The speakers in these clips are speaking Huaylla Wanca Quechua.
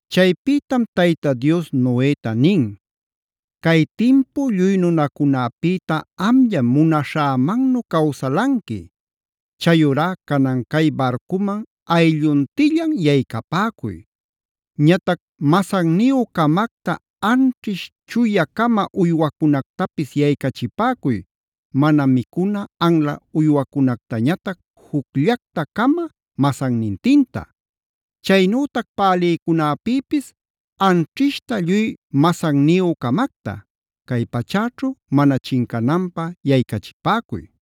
Chaypïtam Tayta Dios Noeta nin: “Cay timpu lluy nunacunäpïta amllam munaśhämannu cawsalanqui. Chayurá canan cay barcuman aylluntillan yaycapäcuy. Ñatac masanniyü-camacta anćhish chuya-cama uywacunactapis yaycachipäcuy, mana micuna anla uywacunactañatac jucllacta-cama masannintinta. Chaynütac pälïcunäpïpis anćhishta lluy masanniyü-camacta, cay pachäćhu mana chincananpä yaycachipäcuy.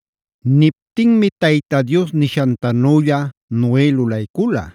Niptinmi Tayta Dios nishantanülla Noe lulaycula.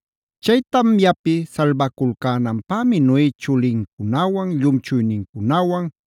Chay tamyapi salbaculcänanpämi Noe chulincunawan, llumchuynincunawan,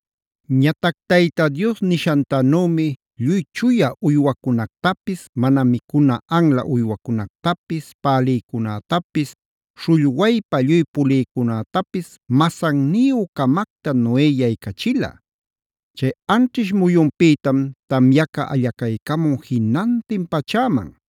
Ñatac Tayta Dios nishantanümi lluy chuya uywacunactapis, mana micuna anla uywacunactapis, pälïcunätapis, śhullwaypa lluy pulïcunätapis masanniyü-camacta Noe yaycachila. Chay anćhish muyunpïtam tamyaca allacaycamun jinantin pachäman.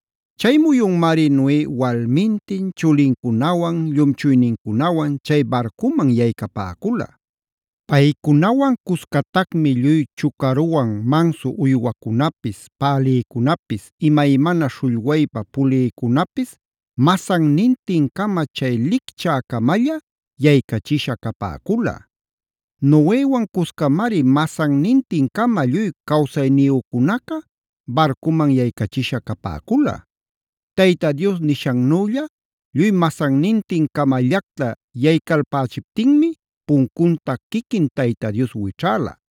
Chay muyunmari Noe walmintin, chulincunawan, llumchuynincunawan chay barcuman yaycapäcula. Paycunawan cuscatacmi lluy chucaruwan mansu uywacunapis, pälïcunapis, imaymana śhullwaypa pulïcunapis masannintin-cama chay lichcä-camalla yaycachisha capäcula. Noewan cuscamari masannintin-cama lluy cawsayniyücunaca barcuman yaycachisha capäcula. Tayta Dios nishannülla lluy masannintin-camallacta yaycalpächiptinmi puncunta quiquin Tayta Dios wićhäla.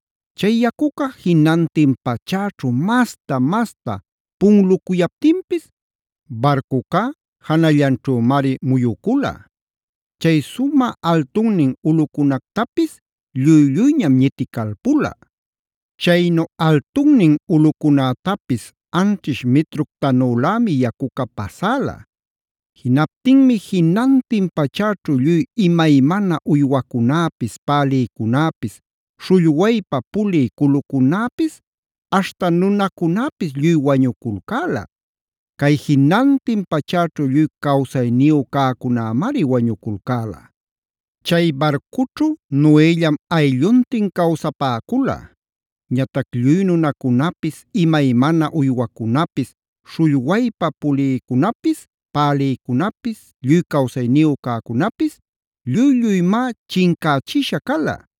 Chay yacuca jinantin pachäćhu masta-masta punlucuyaptinpis barcucá janallanćhümari muyucula. Chay sumä altunnin ulꞌucunactapis lluy-lluyñam ñiticalpula. Chaynu altunnin ulꞌucunätapis anćhish mitructanülämi yacuca pasäla. Jinaptinmi jinantin pachäćhu lluy imaymana uywacunäpis, pälïcunäpis, śhullwaypa pulï culucunäpis aśhta nunacunäpis lluy wañuculcäla. Cay jinantin pachäćhu lluy cawsayniyu cäcunämari wañuculcäla. Chay barcućhu Noellam aylluntin cawsapäcula. Ñatac lluy nunacunapis, imaymana uywacunapis, śhullwaypa pulïcunapis, pälïcunapis, lluy cawsayniyu cäcunäpis lluy-lluymá chincächisha cala.